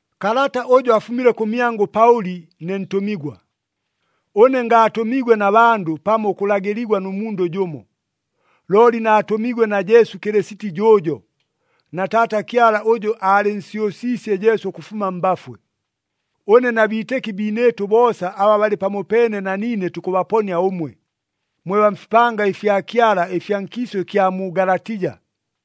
Kalata ʉjʉ afumile kʉmyangʉ Paʉli ne ntʉmigwa. Ʉne ngaatʉmiigwe na bandʉ pamo ʉkʉlagɨligwa nʉ mundʉ jʉmo. Looli naatʉmiigwe na Jesu Kɨlɨsiti jʉʉjo, na Taata Kyala ʉjʉ aalɨnsyʉsiisye Jesu ʉkʉfuma mbafwe. Ʉne na biitɨki biinɨɨtʉ boosa aba balɨ pamopeene na niine tukʉbaponia ʉmwe, mwe baa mfipanga ɨfya Kyala ɨfya nkiisʉ ɨkya mu Galatija.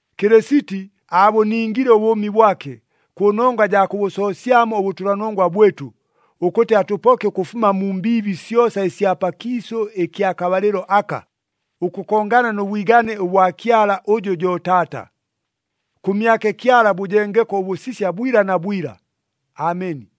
Kɨlɨsiti aabʉningile ʉbʉʉmi bwake, kʉnongwa jaa kʉbʉsoosyamo ʉbʉtʉlanongwa bwɨtʉ, ʉkʉtɨ atʉpoke ʉkʉfuma mu mbiibi syosa ɨsya pakiisʉ ɨkya kabalɨlo aka, ʉkʉkongana nʉ bwigane ʉbwa Kyala ʉjʉ jo Taata. Kʉmyake Kyala bʉjengeko ʉbʉsisya bwila na bwila. Ameni.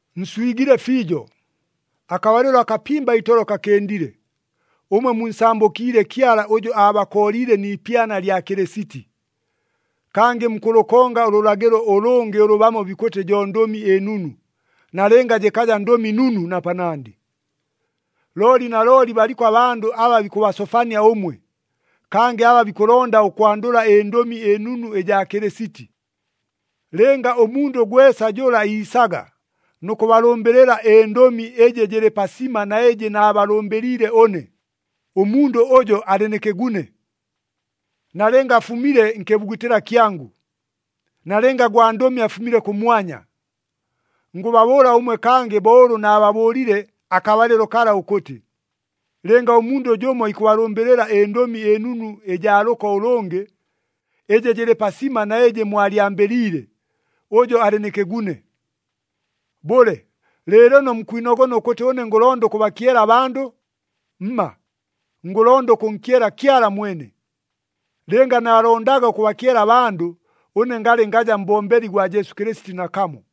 Nswigile fiijo, akabalɨlo akapimba itolo kakɨndile, ʉmwe munsambʉkiile Kyala ʉjʉ aabakooliile ni ipyana lya Kɨlɨsiti. Kangɨ mukʉlʉkonga ʉlʉlagɨlo ʉlʉngɨ ʉlʉ bamo bikʉtɨ jo Ndʉmi ɨNunu, nalɨnga jɨkaja Ndʉmi Nunu na panandɨ. Looli nalooli baliko abandʉ aba bikʉbasofania ʉmwe, kangɨ aba bikʉlonda ʉkwandʉla ɨNdʉmi ɨNunu ɨjaa Kɨlɨsiti. Lɨnga ʉmundʉ gwesa jʉla iisaga nʉ kʉbalʉmbɨlɨla ɨndʉmi ɨjɨ jɨlɨ pasima na ɨjɨ naabalʉmbɨliile ʉne, ʉmundʉ ʉjo alɨ nɨ kɨgune! Nalɨnga afumile nkɨbugutɨla kyangʉ! Nalɨnga gwandʉmi afumile kʉmwanya! Ngʉbabʉʉla ʉmwe kangɨ bo ʉlʉ naababʉʉlile akabalɨlo kala ʉkʉtɨ, lɨnga ʉmundʉ jʉmo ikʉbalʉmbɨlɨla ɨNdʉmi ɨNunu ɨjaa lʉko ʉlʉngɨ, ɨjɨ jɨlɨ pasima na ɨjɨ mwalyambɨliile, ʉjo alɨ nɨ kɨgune! Bʉle, lɨɨlɨno mukwinogona ʉkʉtɨ ʉne ngʉlonda ʉkʉbakyela abandʉ? Mma, ngʉlonda ʉkʉnkyela Kyala mwene! Lɨnga naalondaga ʉkʉbakyela abandʉ, ʉne ngalɨ ngaja mbombeli gwa Jesu Kɨlɨsiti nakamo.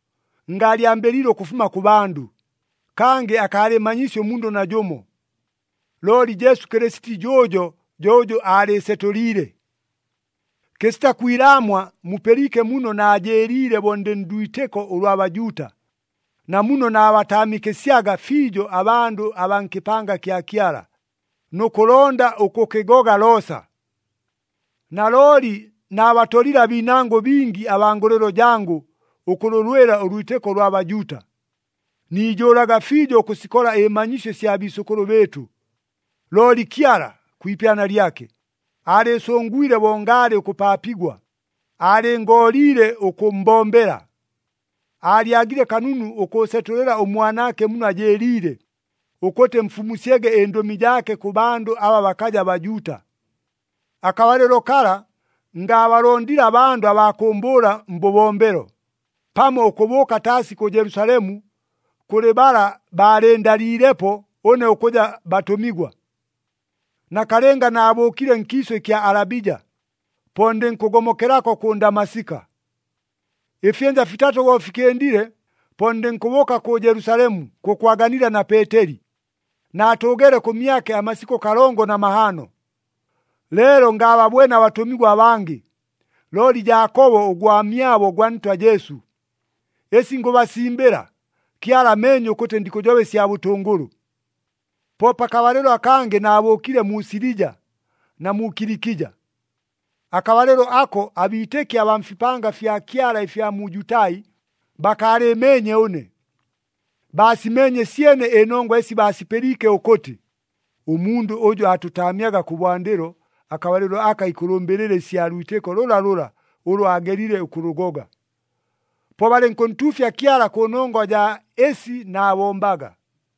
Ngaalyambɨliile ʉkʉfuma kʉ bandʉ, kangɨ akaalɨɨmanyiisye ʉmundʉ najʉmo. Looli Jesu Kɨlɨsiti jʉʉjo jo ʉjʉ aalɨɨsetʉliile. Kɨsita kwilaamwa mupɨliike muno naajɨɨliile bo ndɨ ndwitɨko ʉlwa Bajuuta, na muno naabataamikɨsyaga fiijo abandʉ abaa nkɨpanga kya Kyala, nʉ kʉlonda ʉkʉkɨgoga loosa. Nalooli naabatolile abiinangʉ bingi abaa ngʉlɨlo jangʉ ʉkʉlʉlwɨla ʉlwitɨko ʉlwa Bajuuta. Niijʉʉlaga fiijo ʉkʉsikola ɨmanyisyo ɨsya biisʉkʉlʉ bɨɨtʉ. Looli Kyala, kwi ipyana lyake, aalɨɨsʉngwile bo ngaalɨ ʉkʉpaapigwa, aalɨngooliile ʉkʉmmbombela. Aalyagile kanunu ʉkʉʉsetʉlɨla ʉMwanaake muno ajɨɨliile, ʉkʉtɨ mfumusyege ɨndʉmi jaake kʉ bandʉ aba bakaja Bajuuta. Akabalɨlo kala ngaabalondile abandʉ abaa kʉʉmbʉʉla mbʉbombelo, pamo ʉkʉbʉʉka taasi kʉ Jelusalemu kʉlɨ bala baalɨndaliilepo ʉne ʉkʉja batʉmigwa. Nakalɨnga naabʉʉkile nkiisʉ ɨkya Alabija, po ndɨnkʉgomokelako kʉ Ndamasika. Ɨfyɨnja fitatʉ bo fikɨndile, po ndɨnkʉbʉʉka kʉ Jelusalemu kʉkwaganila na Peeteli, naatʉʉgeele kʉmyake amasikʉ kalongo na mahaano. Leelo ngaababwene abatʉmigwa abangɨ, looli Jaakobo ʉgwamyabo gwa Ntwa Jesu. Ɨsi ngʉbasimbɨla, Kyala ameenye ʉkʉtɨ ndikʉjoba ɨsya bʉtʉngʉlʉ. Po pakabalɨlo akangɨ naabʉʉkile mu Silija na mu Kilikija. Akabalɨlo ako abiitɨki abaa mfipanga fya Kyala ɨfya mu Jutai, bakaalɨɨmeenye ʉne. Baasimeenye syene ɨnongwa ɨsi baasipɨliike ʉkʉtɨ, “Ʉmundʉ ʉjʉ aatʉtaamyaga kʉbwandɨlo, akabalɨlo aka ikʉlʉmbɨlɨla ɨsya lwitɨko lʉlalʉla ʉlʉ aagelile ʉkʉlʉgoga.” Po balɨnkʉntuufya Kyala kʉnongwa jaa ɨsi naabombaga.